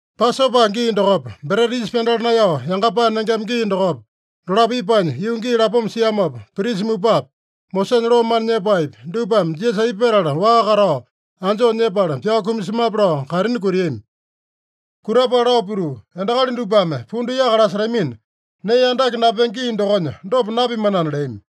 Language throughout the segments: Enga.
Pasopa gii dokopa, Breta Yisa Pyandala Naeyao Yangapae Nengema gii dokopa, dolapo ipanya yuu gii lapoma siamopa, prisa mupapi, Mosesanya loo mana nyepaepi, dupame Jisasa aipa petala waa katao anjoo nyepala pyao kumasemape lao kaitini kutiami. Kutapala lao pituu, “Endakali dupame pundu yaka lasetamina, nee andake napenge gii dokonya dopa napimanana” leami.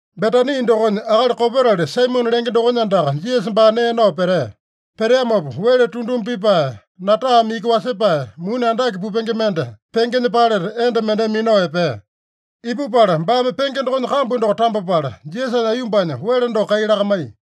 Betani dokonya akali kopetali Saimone lenge dokonya andaka Jisasa baa nee nao petea. Peteamopa wele tunduma pipae, natame iki wele wasepae, muni andake pupenge mende pengenya paleta enda mendeme minao epea. Ipupala baame penge dokonya kambu doko tambapala, Jisasanya aiyombanya wele doko kai lakamaiya.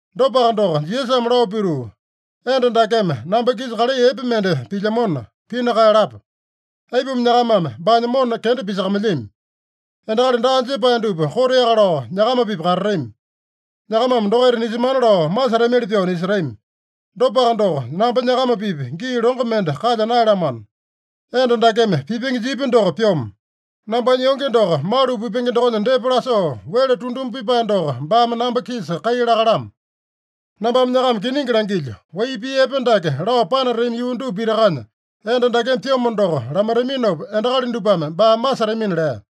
Dopaka doko, Jisasame lao pituu, “Enda dakeme namba-kisa kalai epe mende pilyamona, pina kaeyalapa. Aipuma nyakamame baanya mona kenda pisakamailyami? Endakali daa jepae dupa koteaka lao nyakama-pipa katatami. Nyakamame dokaita nisemana lao masetamili pyoo nisetami. Dopaka doko, namba nyakama-pipa gii longo mende kalya naeyalamano. Enda dakeme pipenge jipya doko pyomo. Nambanya yonge doko malu pipenge dokonya depa lasoo, wele tunduma pipae doko baame namba-kisa kai lakalamo. Nambame nyakama kiningi langilyo: Wai pii epe dake lao panatami yuu dupa pitakanya, enda dakeme pyomo doko lamaitaminopa, endakali dupame baa masetamina” lea.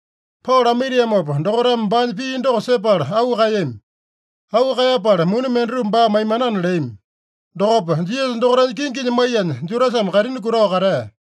Pao lamaitiamopa, dokaitame baanya pii doko sepala auu kaeyami. Auu kaeyapala muni mendatupa baa maimanana leami. Dokopa Jisasa dokaitanya kinginya maiyanya Judasame kaitini kutao katea.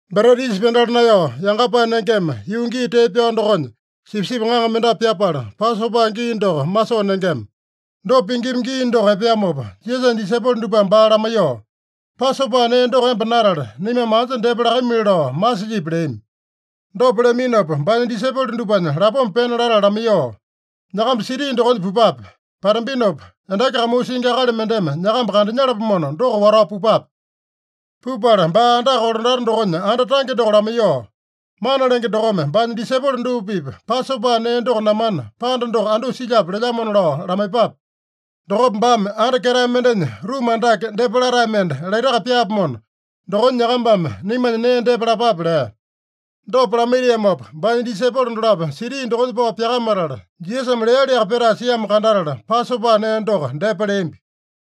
Breta Yisa Pyandala Naeyao Yangapae Nengema, yuu gii tee pyao dokonya, sipisipi ŋaŋa mendapu pyapala, Pasopa gii doko masoo nengema. Dopa pingima gii doko epeamopa, Jisasanya disaipolo dupame baa lamaiyoo, “Pasopa nee doko emba natale, naimame anja depa lakamili lao masilyipi?” leami. Dopa leaminopa, baanya disaipolo dupanya lapoma pena latala lamaiyoo, “Nyakamba siti dokonya pupape. Patambinopa endaki kamuu singi akali mendeme nyakamba kandanyalapomona, doko watao pupape. Pupala baa andaka kolandata dokonya anda tange doko lamaiyoo, ‘Mana Lenge dokome baanya disaipolo dupa-pipa Pasopa nee doko namana, panda doko andusa silyape lelyamona’ lao lamaiyepape. Dokopa baame anda ketae mendenya ruma andake, depa latae mende laitaka pyaapomona, dokonya nyakambame naimanya nee depa lapape” lea. Dopa lamaitiamopa, baanya disaipolo dolapo siti dokonya pao pyakamatala, Jisasame lealiaka petae siamo kandatala, Pasopa nee doko depa leambi.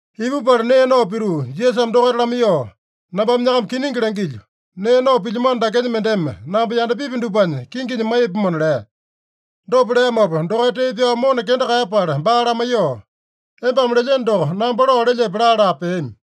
Ipupala nee nao pituu, Jisasame dokaita lamaiyoo, “Nambame nyakama kiningi langilyo: Nee nao pilyamano dakenya mendeme namba yandapipi dupanya kinginya maiyapomona” lea. Dopa leamopa, dokaita tee pyao mona kenda kaeyapala baa lamaiyoo, “Embame lelyeno doko namba lao lelyepe?” laa-laa peami.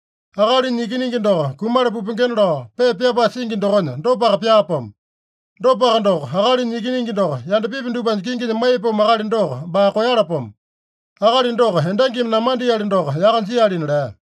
Akalinya Ikiningi doko kumala pupengena lao pepa pyapae singi dokonya, dopaka pyaapomo. Dopaka doko, Akalinya Ikiningi doko yandapipi dupanya kinginya maiyapomo akali doko baa koeyalapomo! Akali doko endangimi namandeali doko yaka jialina” lea.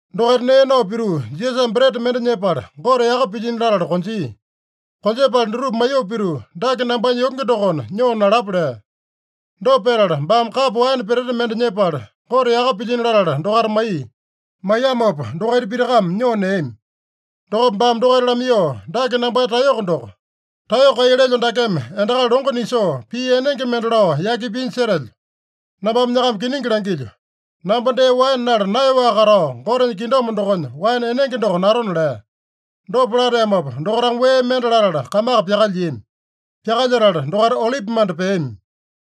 Dokaita nee nao pituu, Jisasame breta mende nyepala, Gote yaka pilyino latala konjia. Konjepala dutupa maiyoo pituu, “Dake nambanya yonge dokona, nyoo nalapa” lea. Dopa petala baame kapo waene peteta mende nyepala, Gote yaka pilyino latala dokaita maiya. Maiyamopa dokaita pitakame nyoo neami. Dokopa baame dokaita lamaiyoo, “Dake nambanya taeyoko doko. Taeyoko kai lelyo dakeme endakali longo nisoo, pii enenge mende lao yaki pinya setelyo. Nambame nyakama kiningi langilyo: Namba dee waene nala naeyaowaka katao, Gotenya kingdom dokonya waene enenge doko natona” lea. Dopa lateamopa, dokaitame wee mende latala kamaka pyakalyiami. Pyakalyetala dokaita Olipimanda peami.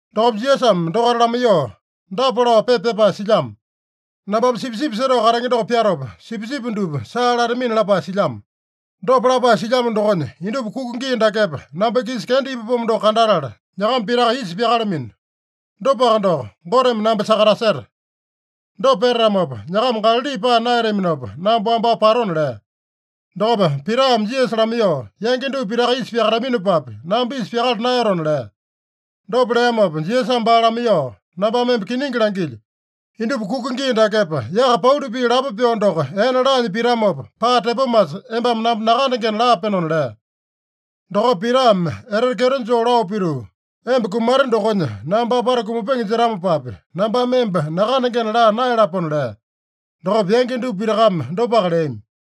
Dokopa Jisasame dokaita lamaiyoo, “Dapa lao pepa pyapae silyamo: ‘Nambame sipisipi setao katenge doko pyatopa, sipisipi dupa saa latamina’ lapae silyamo. Dopa lapae silyamo dokonya, indupa kuka gii dakepa, namba-kisa kenda ipapomo doko kandatala, nyakama pitaka isa pyakalamino. Dopaka doko, Goteme namba sakataseta. Dopa petatamopa, nyakama Galali paa naeyataminopa, namba wambao patona” lea. Dokopa Pitame Jisasa lamaiyoo, “Yangi dupa pitaka isa pyakataminopapi, namba isa pyakala naeyatona” lea. Dopa leamopa Jisasame baa lamaiyoo, “Nambame emba kiningi langilyo: Indupa kuka gii dakepa, yaka pauli pii lapo pyoo doko ene laanya pitamopa, paa tepomasa embame namba nakandengena laapenona” lea. Dokopa Pitame etete kyeto joo lao pituu, “Emba kumate dokonya namba apata kumapenge jetamopapi, nambame emba nakandengena laa naeyalapona” lea. Dokopa yangi dupa pitakame dopaka leami.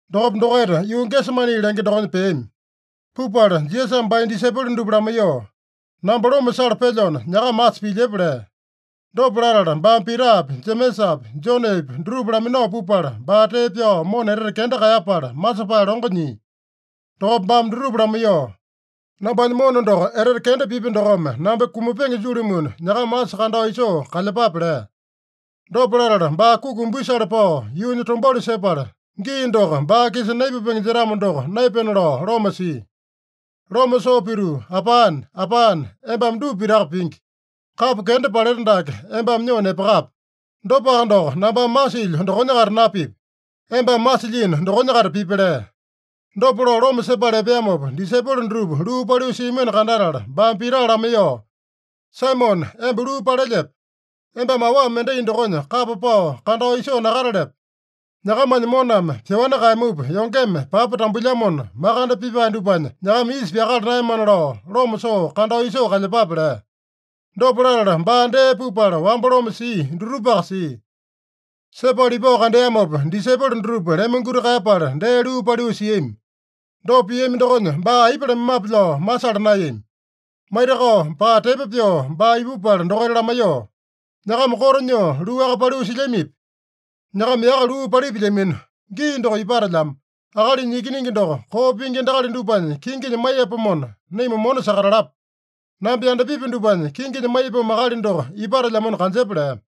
Dokopa dokaita yuu Gesemani lenge dokonya peami. Pupala Jisasame baanya disaipolo dupa lamaiyoo, “Namba loma sala pelyona, nyakama asa pilyepa” lea. Dopa latala baame Pitapi, Jemesapi, Jonepi dutupa laminao pupala, baa tee pyao mona etete kenda kaeyapala masepae longo nyia. Dokopa baame dutupa lamaiyoo, “Nambanya mona doko etete kenda pipya dokome namba kumapenge julumuna, nyakama asa kandao isoo kalyepape” lea. Dopa latala baa kuki umbisale pao, yuunya tombauli sepala, gii doko baa-kisa naipupenge jetamo doko, naepena lao loma sia. Loma soo pituu, “Apane, Apane, embame dupa pitaka pingi. Kapo kenda paleta dake embame nyoo nepakape. Dopaka doko, nambame masilyo dokonya-kaita napipi. Embame masilyino dokonya-kaita pipi” lea. Dopa lao loma sepala epeamopa, disaipolo dutupa luu paliu siamino kandatala, baame Pita lamaiyoo, “Saimone, emba luu palelyepe? Embame awa mendai dokonya kapa pao kandao isoo nakatalepe? Nyakamanya moname pyoani kaeyamupa, yongeme papa tambuilyamona, makande pipae dupanya nyakama isa pyakala naeyamana lao loma soo kandao isoo kalyepape” lea. Dopa latala baa dee pupala, wamba loma sia dutupaka sia. Sepala ipao kandeamopa, disaipolo dutupa lemonguti kaeyapala dee luu paliu siami. Dopa piami dokonya, baa aipa lamaimape lao masala naeyami. Maitakao, paa tepo pyoo baa ipupala dokaita lamaiyoo, “Nyakama koto nyoo luaka paliu silyamipi? Nyakama yaka luu palipilyamino. Gii doko ipatelyamo. Akalinya Ikiningi doko koo pingi endakali dupanya kinginya maiyapomona, naima mona sakatalapa. Namba yandapipi dupanya kinginya maiyapomo akali doko ipatelyamona kanjepa” lea.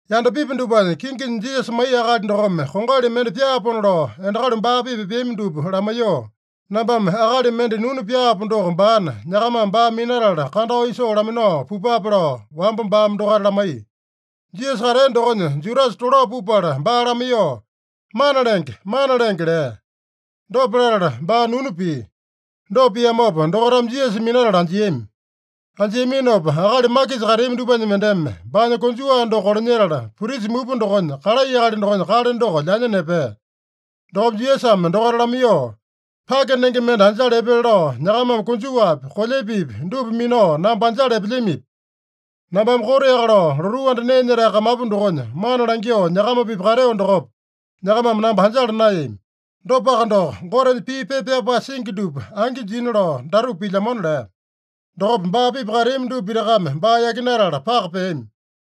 Yandapipi dupanya kinginya Jisasa maiya akali dokome kongali mende pyaapona lao endakali baa-pipa epeami dupa lamaiyoo, “Nambame akali mende nunu pyaapo doko baana, nyakamame baa minatala kandao isoo laminao pupape” lao wamba baame dokaita lamaiya. Jisasa katea dokonya Judasa tolao pupala baa lamaiyoo, “Mana Lenge, Mana Lenge!” lea. Dopa latala baa nunu pia. Dopa piamopa dokaitame Jisasa minatala anjiami. Anjiaminopa akali makisa kateami dupanya mendeme baanya konjuwa doko kolanyetala, prisa mupa dokonya kalai akali dokonya kale doko lyanya nepea. Dokopa Jisasame dokaita lamaiyoo, “Pake nenge mende anjala epele lao nyakamame konjuwapi, kolyepepi dupa minao namba anjala epelyamipi? Nambame koteaka lao lotuu anda nee nyetae kamapu dokonya mana langyoo nyakama-pipa kateo dokopa, nyakamame namba anjala naeyami. Dopaka doko, Gotenya pii pepa pyapae singi dupa angi jina lao datupa pilyamona” lea. Dokopa baa-pipa kateami dupa pitakame baa yakinatala paka peami.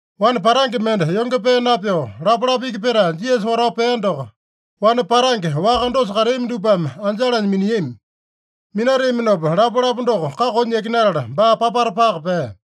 Wane patange mende yonge pee napyoo lapalapa iki petae, Jisasa watao pea doko, wane patange waka dosa kateami dupame anjalanya miniami. Minateaminopa lapalapa doko kakonya yakinatala, baa papata paka pea.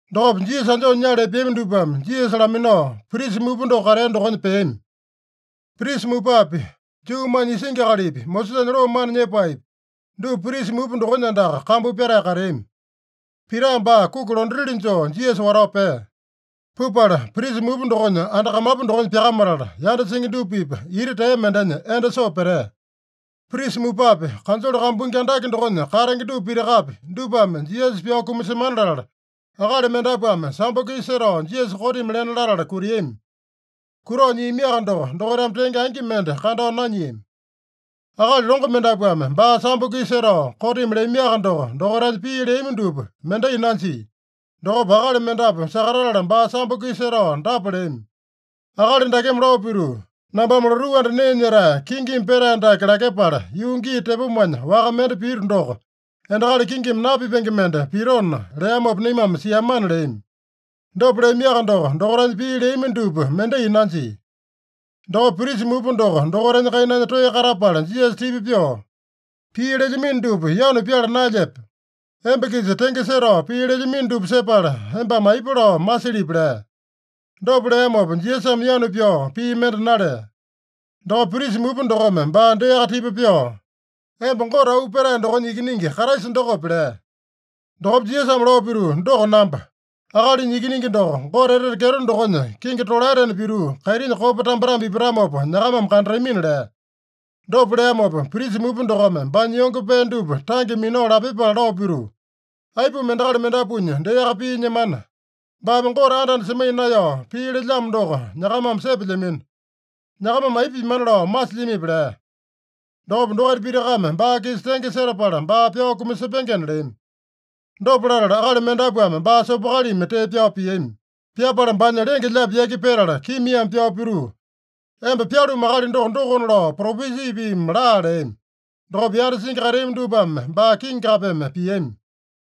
Dokopa Jisasa anjoo nyala epeami dupame Jisasa laminao, prisa mupa doko katea dokonya peami. Prisa mupapi, Juumanya isingi akalipi, Mosesanya loo mana nyepaepi, dupa prisa mupa dokonya andaka kambu pyatae kateami. Pita baa kuki londatili joo Jisasa watao pea. Pupala prisa mupa dokonya anda kamapu dokonya pyakamatala, yanda singi dupa-pipa ita tea mendenya endo soo petea. Prisa mupapi, kanjole kambuingi andake dokonya katenge dupa pitakapi, dupame Jisasa pyao kumasemana latala, akali mendapuame sambo-kisa setao Jisasa kotimi lena latala kutiami. Kutao nyiamiaka doko, dokaitame tenge angi mende kandao nanyiami. Akali longo mendapuame baa sambo-kisa setao kotimi leamiaka doko, dokaitanya pii leami dupa mendai nanjia. Dokopa akali mendapu sakatatala baa sambo-kisa setao dapa leami: “Akali dakeme lao pituu, ‘Nambame lotuu anda nee nyetae, kingimi petae dake lakyepala, yuu gii tepomanya waka mende pito doko, endakali kingimi napipenge mende pitona’ leamopa naimame siamana” leami. Dopa leamiaka doko, dokaitanya pii leami dupa mendai nanjia. Dokopa prisa mupa doko dokaitanya kainanya toeya katapala Jisasa tipa pyoo, “Pii lelyamino dupa yanu pyala naelyepe? Emba-kisa tenge setao pii lelyamino dupa sepala, embame aipa lao masilyipi?” lea. Dopa leamopa Jisasame yanu pyao pii mende nalea. Dokopa prisa mupa dokome baa deaka tipa pyoo, “Emba Gote Auu Petae dokonya Ikiningi Kraisa dokope?” lea. Dokopa Jisasame lao pituu, “Doko namba. Akalinya Ikiningi doko Gote etete kyeto dokonya kingi tolaetena pituu, kaitinya kopa tambetambe ipatamopa nyakamame kandatamina” lea. Dopa leamopa, prisa mupa dokome baanya yonge pee dupa tange minao lapyepala lao pituu, “Aipuma endakali mendapuanya deaka pii nyemana? Baame Gote anda-anda semaiya naeyao pii lelyamo doko nyakamame sepelyamino. Nyakamame aipa pimana lao masilyamipi?” lea. Dokopa dokaita pitakame baa-kisa tenge setapala, baa pyao kumasepengena leami. Dopa latala akali mendapuame baa sopokalimi tee pyao piami. Pyapala baanya lenge-lyaapi yaki petala, kimiame pyao pituu, “Emba pyalumu akali doko, dokona lao propesi piimi laa!” leami. Dokopa yanda singi kateami dupame baa kingi kapeme piami.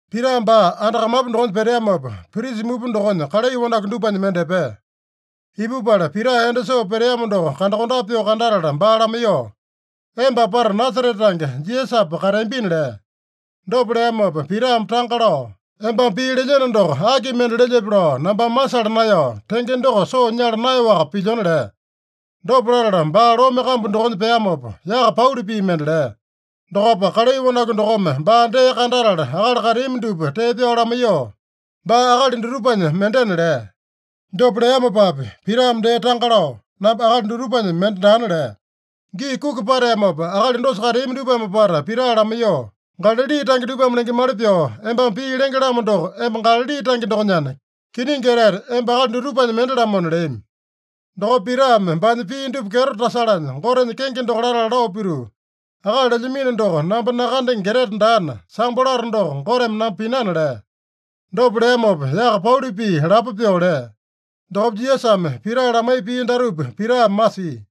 Pita baa anda kamapu dokonya peteamopa, prisa mupa dokonya kalai wanaku dupanya mende epea. Ipupala Pita endo soo peteamo doko kandakondape pyoo kandatala baa lamaiyoo, “Emba apata Nasarete tange Jisasapa kateambina” lea. Dopa leamopa Pitame tanga lao, “Embame pii lelyeno doko aki mende lelyepe lao nambame masala naeyao, tenge doko soo nyala naeyaowaka pilyona” lea. Dopa latala baa lome kambu dokonya peamopa, yaka pauli pii mende lea. Dokopa kalai wanaku dokome baa dee kandatala akali kateami dupa tee pyao lamaiyoo, “Baa akali dutupanya mendena” lea. Dopa leamopapi Pitame dee tanga lao, “Namba akali dutupanya mende daana” lea. Gii kuki pateamopa, akali dosa kateami dupame apata Pita lamaiyoo, “Galali tange dupame lengemali pyoo embame pii lenge-lamo doko emba Galali tange dokonyana, kiningi etete emba akali dutupanya mende-lamona” leami. Dokopa Pitame baanya pii dupa kyeto tasalanya Gotenya kenge doko latala lao pituu, “Akali lelyamino doko namba nakandenge etete daana, sambo lato doko Goteme namba pinana” lea. Dopa leamopa yaka pauli pii lapo pyoo lea. Dokopa Jisasame Pita lamaiya pii datupa Pitame masia: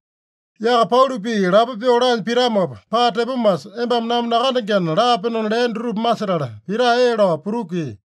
“Yaka pauli pii lapo pyoo laanya pitamopa, paa tepomasa embame namba nakandengena laapenona” lea dutupa masetala, Pita ee lao putukia.